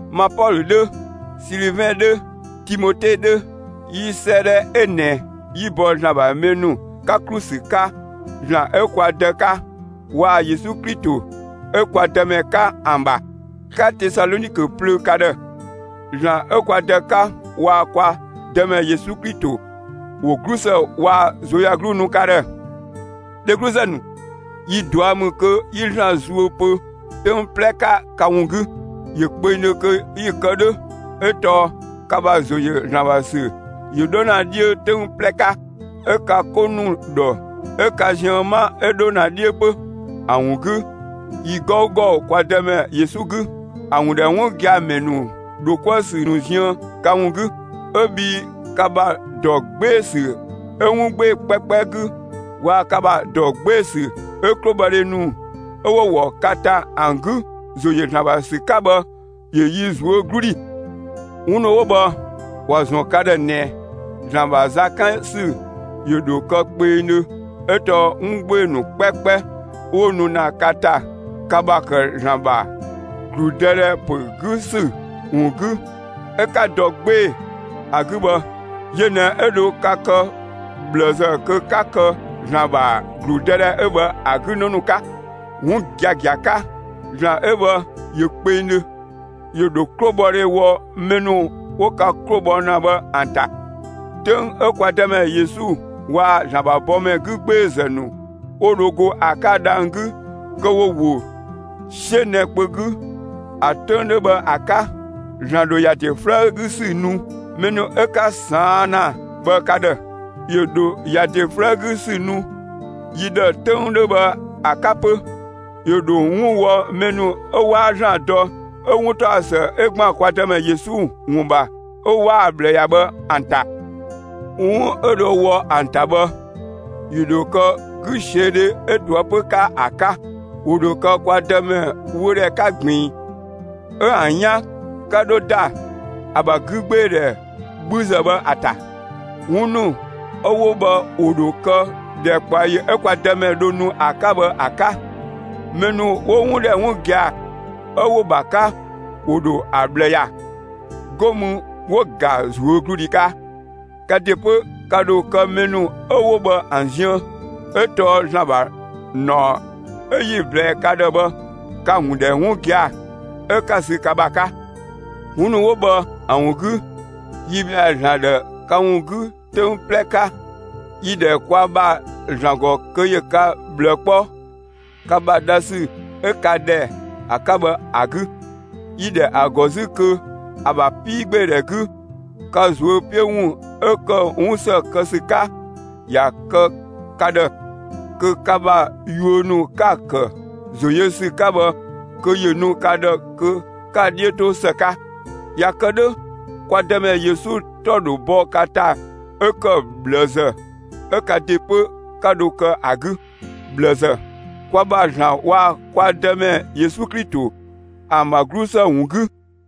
Ma Pɔlö 'dhö, Silivɛn 'dhö, Timote 'dhö, 'yi 'sëëdhɛ 'ö ꞊nɛ 'yi‑ bɔ ‑Zlan ‑bha mɛ ‑nu 'ka ‑klu ‑sü 'ka ‑Zlan 'ö kwa Dë 'ka waa‑ Yesu Klito 'ö kwa Dëmɛ 'ka ‑an ‑bha, 'ka Tesalɔnikö plöö ka ‑dhë. ‑Zlan 'ö kwa Dë 'ka waa‑ kwa Dëmɛ Yesu Klito ‑wo 'glusë waa‑ ꞊zuöyagluu nu ka ‑dhë. Dhegluzë ‑nu, yi ꞊dua' ‑mü kö 'yi ‑Zlan zuö pö 'töng 'plɛ 'ka ka ‑wun 'gü. ‑Yö kpengdhö kö 'yi‑ kë 'dhö 'ö tɔɔ ka ‑bha ‑zo ‑yö ‑Zlan ‑bha ‑sü ‑yö 'dho ‑na 'dhiö 'töng 'plɛ 'ka. 'Ö ka 'ko ‑nu ‑dhɔ 'ö ka ziën 'ma 'ö 'dho ‑na 'dhiö 'pö. ‑A ‑wun 'gü, yi 'gɔugɔ (kwa Dëmɛ Yesu 'gü), ‑a ‑wun ‑dhɛ 'wun gia‑ ‑mɛ ‑nu ‑dho 'kuë‑ ‑sü ‑nu ziën ka ‑wun 'gü, 'ö bhii ka ‑bha ‑dɔ 'gbee‑ ‑sü 'ö 'wun 'gbee‑ 'kpɛkpɛ 'gü waa‑ ka ‑bha ‑dɔ 'gbee‑ ‑sü 'ö 'klobhɔdhe ‑nu 'ö 'wo‑ ‑wɔ ka ‑ta ‑an 'gü ‑zo ‑yö ‑Zlan ‑bha ‑sü 'ka bhë ‑yö yi ꞊zuö' 'glu ‑dhi. 'Wun ‑nu 'wo bhë ‑wa ‑zɔn ka ‑dhë ꞊nɛ ‑Zlan ‑bha za 'kan ‑sü ‑yö ‑dho kë kpengdhö 'ö tɔɔ 'wun 'gbee‑ ‑nu 'kpɛkpɛ 'ö 'wo nu ‑na ka ‑ta, ka ‑bha ‑kë ‑Zlan ‑bha ‑gludëdhɛ ‑pö 'gü ‑sü ‑wun 'gü 'ö 'ka dɔ 'gbee‑ ‑a 'gü bhë, yö ꞊nɛ 'ö dho ka kë ꞊bhlëzë kö 'ka kë ‑Zlan ‑bha ‑gludëdhɛ 'ö bhë ‑a 'gü 'në ‑nu 'ka. 'Wun giagia 'ka ‑Zlan 'ö bhë ‑yö kpengdhö, ‑yö ‑dho 'klobhɔdhe wɔ mɛ ‑nu 'wo ka 'klo bhɔ ‑na bhë ‑an ‑ta. 'Töng 'ö kwa Dëmɛ Yesu waa‑ ‑Zlan ‑bha bɔmɛ 'gü 'gbeezë ‑nu 'wo dho go ‑a 'ka dhang‑ 'gü kö ‑wo ‑wo 'siö nɛ‑ kpö 'gü, ‑a 'töng 'dhö bhë ‑a 'ka, ‑Zlan ‑dho ‑ya ‑de 'flëë‑ 'gü ‑sü nu mɛ ‑nu 'ö 'ka ꞊saan' ‑na bhë ka ‑dhë; ‑yö ‑dho ‑ya ‑de 'flëë‑ 'gü ‑sü nu yi ‑dhë 'töng 'dhö bhë ‑a 'ka 'pö. ‑Yö ‑dho 'wun wɔ mɛ ‑nu 'ö 'waa ‑Zlan dɔ 'ö 'wuntaɔsë 'ö ‑gban kwa Dëmɛ Yesu ‑wun ‑bha 'ö 'waa‑ ꞊bhlë ‑ya bhë ‑an ‑ta. 'Wun 'ö dho wɔ ‑an ‑ta bhë, ‑yö ‑dho kë 'güsiödhe 'ö ꞊toëpö 'ka ‑a 'ka. ‑Wo ‑dho kë kwa Dëmɛ wöödhɛ 'ka ꞊gbiin, 'ö ‑an 'yan 'ka 'dho ‑da ‑a ‑bha 'gügbeedhɛ 'bhüzë bhë ‑a ‑ta. 'Wun ‑nu 'ö 'wo bhë ‑wo ‑dho kë ‑dhɛkpaɔyi 'ö kwa Dëmɛ dho nu ‑a 'ka bhë ‑a 'ka; mɛ ‑nu 'wo‑ ‑wun ‑dhɛ 'wun gia‑ 'ö 'wo‑ ‑bha 'ka, ‑wo ‑dho ‑a ꞊bhlë ‑ya, 'go mü 'wo‑ ‑ga ꞊zuögludhi 'ka. Ka ‑de 'pö, ka ‑dho kë mɛ ‑nu 'ö 'wo bhë ‑an ziën, 'ö tɔɔ ‑Zlan ‑bha ‑naɔ 'ö 'yi‑ ꞊blɛɛ ka ‑dhë bhë, ka‑ ‑wun ‑dhɛ 'wun gia‑, 'ö 'ka‑ ‑sü ka ‑bha 'ka. 'Wun ‑nu 'wo bhë ‑an ‑wun 'gü, yi ‑bhɛa ‑Zlan ‑dhë ka ‑wun 'gü 'töng 'plɛ 'ka. Yi‑ ‑dhɛ kwa ‑bha ‑Zlan ‑gɔ kö ‑yö ka ꞊bhlë 'kpɔ ka ‑bha dha ‑sü 'ö ka ‑dhɛ ‑a 'ka bhë ‑a 'gü. Yi‑ ‑dhɛ ‑a ‑gɔ 'zü kö ‑a ‑bha 'piigbeedhɛ 'gü, ka ꞊zuö' 'piö ‑wun 'ö ‑kë 'wun ‑së kë ‑sü 'ka, ‑ya kë ka ‑dhë; kö ka ‑bha yuö ‑nu 'ka‑ ‑kë ‑zo yö ‑sü 'ka bhë kö ‑yö nu ka ‑dhë kö 'ka‑ 'dhiö 'to ‑së 'ka. ꞊Ya kë 'dhö, kwa Dëmɛ Yesu 'tɔ ‑dho bɔ ka ‑ta 'ö ‑kë ꞊bhlëzë 'ö ka ‑de 'pö, 'ka dho kë ‑a 'gü ꞊bhlëzë, kwa ‑bha ‑Zlan waa‑ kwa Dëmɛ Yesu Klito ‑an ‑bha 'glusë ‑wun 'gü.